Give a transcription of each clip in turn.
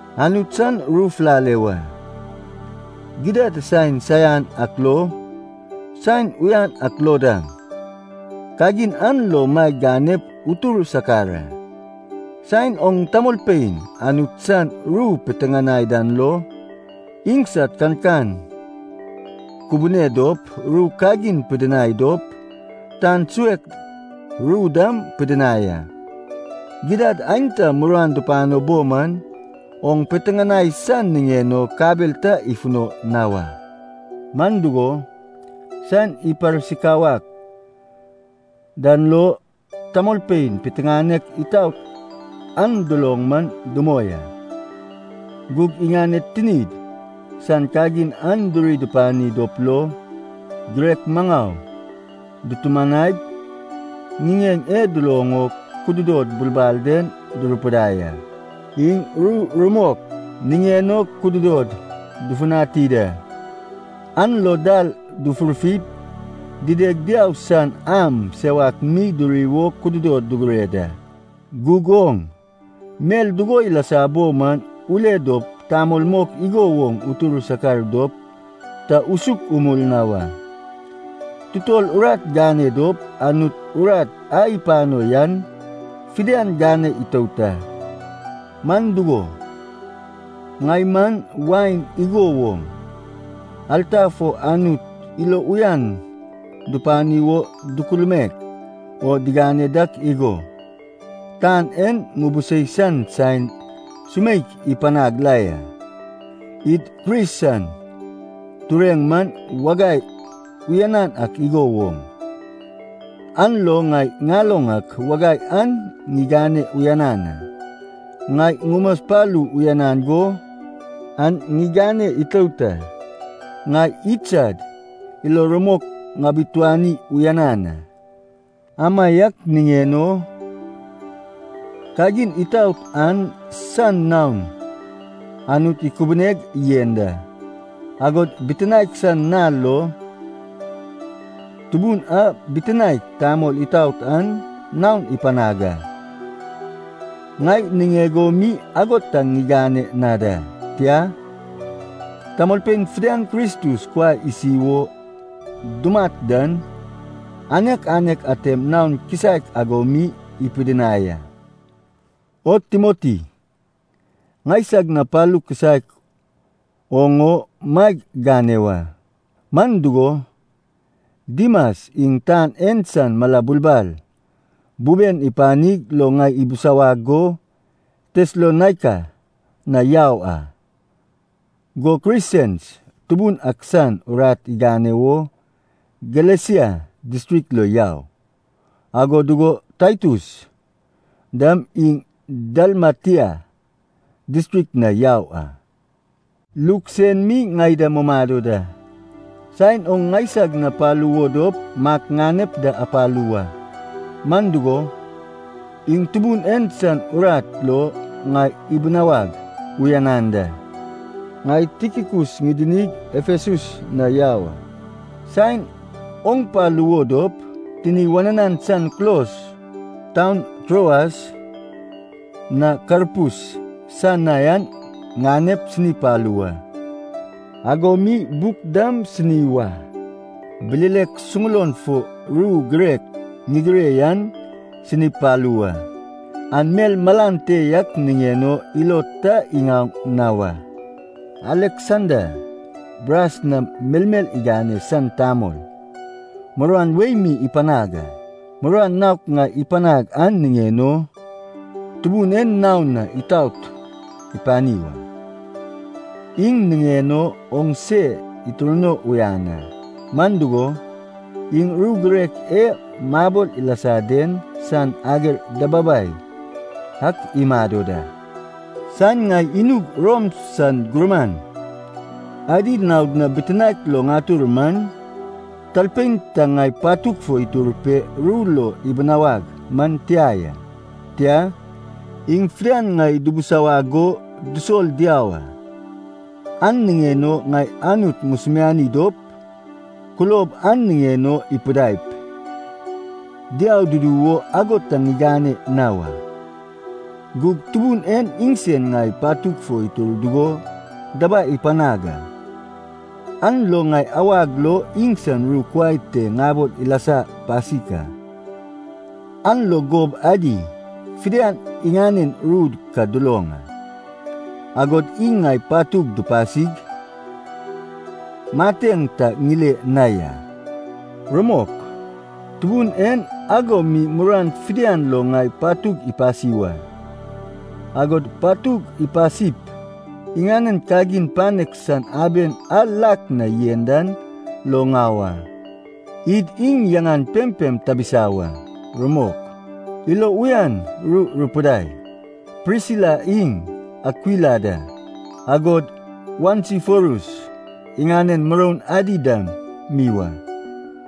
Anut san ru fulale wa, gidad saen saian ak lo, saen uyan ak lo dam, kagin an lo maeg ganep utur sakar a. Saen oŋ tamolpein Anut san ru piteŋanai dan lo, iŋsad kankan kubune dop, ru kagin pidinai dop, tan suek ru dam pidinai a. Gidad aenta muruan dupano bo man, oŋ piteŋanai san niŋen o kabel ta ifuno na wa. Man dugo, saen iparsikawad dan lo, tamolpein piteŋanek itaot an duloŋ man dumoi a. Gug iŋaned tinid san kagin an duri dupani dop lo, girek maŋau dutumanaip ŋiŋeŋ e duloŋ o kududod bulbal den durupidai a. Iŋ ru rumok niŋen o kududod dufutani da. An lo dal dufurfip, dideg diau san am sewak mi duri wo kududod dugure da. Gug oŋ, mel dugo ilasa bo man ule dop tamol mok igo woŋ utur sakar dop ta usuk umul na wa. Tutol urat gane dop, Anut urat a ipano yan fidian gane itout a. Man dugo, ŋai man wain igo woŋ, alta fo Anut ilo uyan dupani wo dukulmaek o digane dak igo, tan en ŋubusei san saen sumeik ipanag la ya. Id Kris sad tureŋ man wagai uyanan ak igo woŋ, an lo ŋai ŋaloŋ ak wagai an ŋigane uyanan a. Ŋai ŋumaspalu uyanan go an ŋigane itout a. Ŋai idsad ilo rumok ŋabituani uyanan a. Amaiak niŋen o, kagin itaot an san naon Anut ikubuneg yen da, agod bitinaek san nal lo Tubun a bitinaek tamol itaot an naon ipanag a. Ŋai niŋeg o mi ago ta igane na da. Tia, tamolpein fidian Kristus kuai isi wo dumat dan anek anek atem naon kisaek ago mi ipidinai a. O Timoti, ŋaisag na palu kisaek oŋ o maeg gane wa. Man dugo, Dimas iŋ tan en san mala bulbal buben ipanig lo ŋai ibisawag go Tesalonaika na yau a. Go Kresens Tubun ak san urat igane wo Galesia distrik lo yau, ago dugo Taitus dam iŋ Dalmatia distrik na yau a. Luk sen mi ŋai da mumado da. Saen oŋ ŋaisag na palu wo dop, Mak ŋanep da apalu wa. Man dugo, iŋ Tubun en san urat lo ŋai ibinawag uyanan da. Ŋai Tikikus ŋidinig Efesus na yau a. Saen oŋ palu wo dop, tini wananan san kulos taun Troas na Karpus san na yan ŋanep sini palu wa. Ago mi buk dam sini wa, bilelek suŋulon fo ru girek ŋigire yan sinip palu wa, an mel malan te yak niŋen o ilo ta iŋaoŋ na wa. Aleksanda, bras nam melmel igane san tamol, muruan wei mi ipanag a. Muruan naok ŋai ipanag an niŋen o, Tubun en naon itaot ipani wa. Iŋ niŋen o oŋ se itirno uyan a, man dugo, iŋ ru girek e mabol ilasa den san ager dababai ak imado da. Saen ŋai inug Rom san gurman adi naod na bitinaek lo ŋatur man, talpein ta ŋai patug fo itur pe ru lo ibinawag man tia ya. Tia, iŋ fidian ŋai dubusawag go dusol diau a. An niŋen o ŋai Anut ŋusumiani dop, kulob an niŋen o ipidaip, diau dudu wo ago ta igane na wa. Gug, Tubun en iŋsen ŋai patug fo itur dugo dabai ipanag a. An lo ŋai awag lo iŋsan ru kuai te ŋabol ilasa pasik a, an lo gob adi fidian iŋanen ru ka duloŋ a. Agod iŋ ŋai patug ipasig mateŋ ta ŋile na ya. Rumok, Tubun en ago mi muruan fidian lo ŋai patug ipasi wa, agod patug ipasip iŋanen kagin panek san aben a lak na yen dan lo ŋau a. Id iŋ yaŋan pempem tabisa wa. Rumok. Ilo uyan ru rupidai, Prisila iŋ Akwila da, agod Onesiforus iŋanen muroun adi dam mi wa.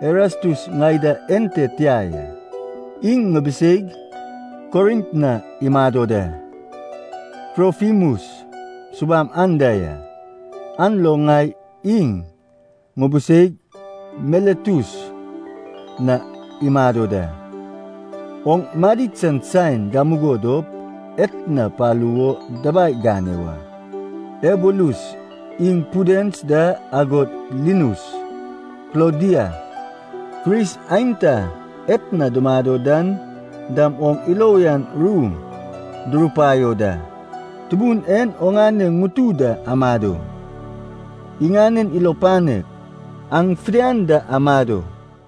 Erastus ŋai da ente tia ya, iŋ ŋubiseig Korint na imado da. Trofimus subam anda ya, an lo ŋai iŋ ŋubuseig Miletus na imado da. Oŋ madid san saen gamugo dop, etna palu wo dabai gane wa. Eubulus iŋ Pudens da agod Linus, Klaudia, Kris aenta etna dumado dan dam oŋ ilo uyan ru durupaio da. Tubun en oŋane ŋutu da amado. Iŋanen ilo panek, aŋ fidian da amado.